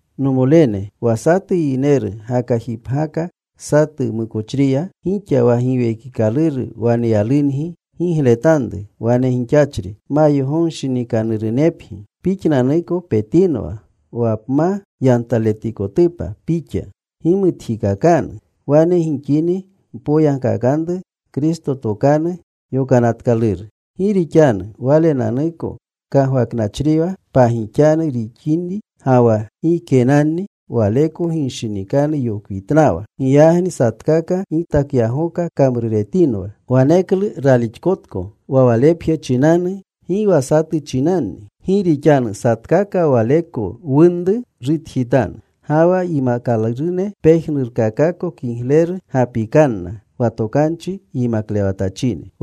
Nomolene, wa satu yineru gakajipgaka satu mukochriya, gixa wa Giwekikaluru waneyalungi gigletanru wane gixachri, mayogonshinikanurunepgi. Pixnanuko petinwa wa pma yantaletikotupa pixa. Gimutjikakanu. Wane gixini mpoyagkakanru Kristotokanu yokanatkaluru. Gi rixanu walenanuko kagwaknachriwa pagixanu rixinri, ga wa gikenanni, waleko ginshinikanu yokwitnawa. Giyagni satkaka gitakyagoka kamruretinwa. Waneklu ralixkotko wa walepje chinanu, gi wa satu chinanni. Gi rixanu satkaka waleko wunnu rutjitanu. Ga wa yimaakalurune pejnurkakako kigleru gapikanna wa tokanchi yimaklewatachine.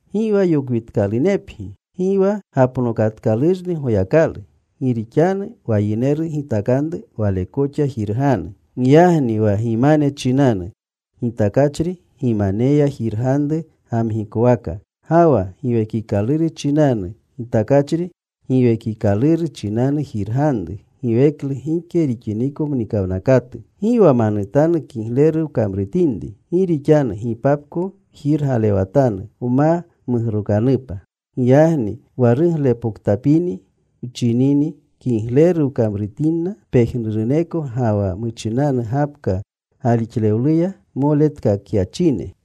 Gi wa yokwitkalunepgi. Gi wa gapnokatkalurni Goyakalu. Gi rixanu wa yineru gitakanru wale koxa jirganu. Giyagni wa gimane chinanu gitakachri, gimaneya jirganru gamgikowaka. Ga wa Giwekikaluru chinanu gitakachri, Giwekikaluru chinanu jirganru giweklu gike rixiniko mnikawnakatu. Gi wamanutanu kigleru wkamrutinri. Gi rixanu gipapko wjirgalewatanu wma mugrokanupa. Giyagni wa ruglepoktapini wchinini, kigleru wkamrutinna pejnuruneko, ga wa muchinanu gapka galixlewluya moletkakyachine.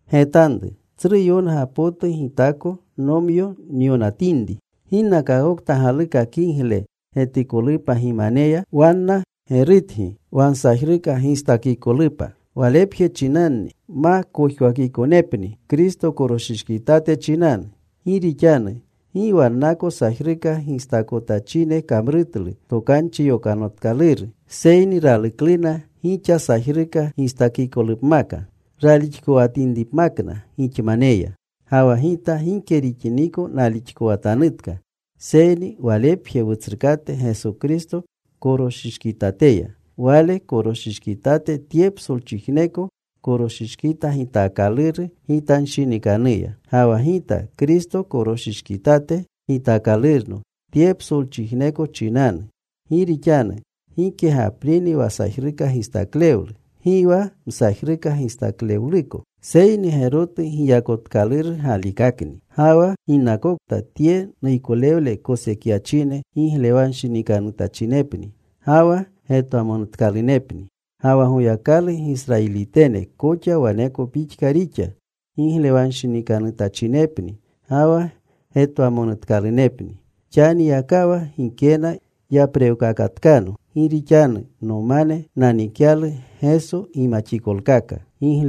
Getanru. Tsru yonga potu gitako nomyo nyonatinri. Ginnakokta galuka kigle getikolupa gimaneya, wanna gerutgi wa nsajruka gistakikolupa. Walepje chinanni wa ma kojwakikonepni Kristo koroshishkitate chinanu. Gi rixanu gi wannako sajruka gistaakotachine kamrutlu Tokanchi Yokanatkaluru. Seyni ralukluna gixa sajruka gistakikolupmaka, ralixkowatinripmakna gixmaneya. Ga wa gita gike rixiniko nalixkowatanutka, seyni walepje Wutsrukate Geso Kristo koroshishkitateya. Wale koroshishkitate tye psolchijneko koroshishkita gitaakaluru gitanshinikanuya. Ga wa gita Kristo koroshishkitate gitaakalurno tye psolchijneko chinanu. Gi rixanu gike gaprini wa sajruka gistaklewlu. Gi wa msajruka gistaklewluko, seyni gerotu giyakotkaluru galikakni. Ga wa ginnakokta tye nuykolewle kosekyachine, giglewanshinikanutachinepni, ga wa getwamonutkalunepni. Ga wa Goyakalu Gisrayilitene koxa waneko pixka rixa giglewanshinikanutachinepni ga wa getwamonutkalunepni. Xaniyakawa gikena yaprewkakanutkano, gi rixanu nomane nanikyalu Geso gimaxikolkaka.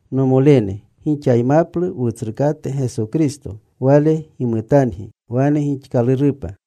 Nomolene, gixaymaplu Wutsrukate Geso Kristo. Wale gimutangi. Wane gixkalurupa.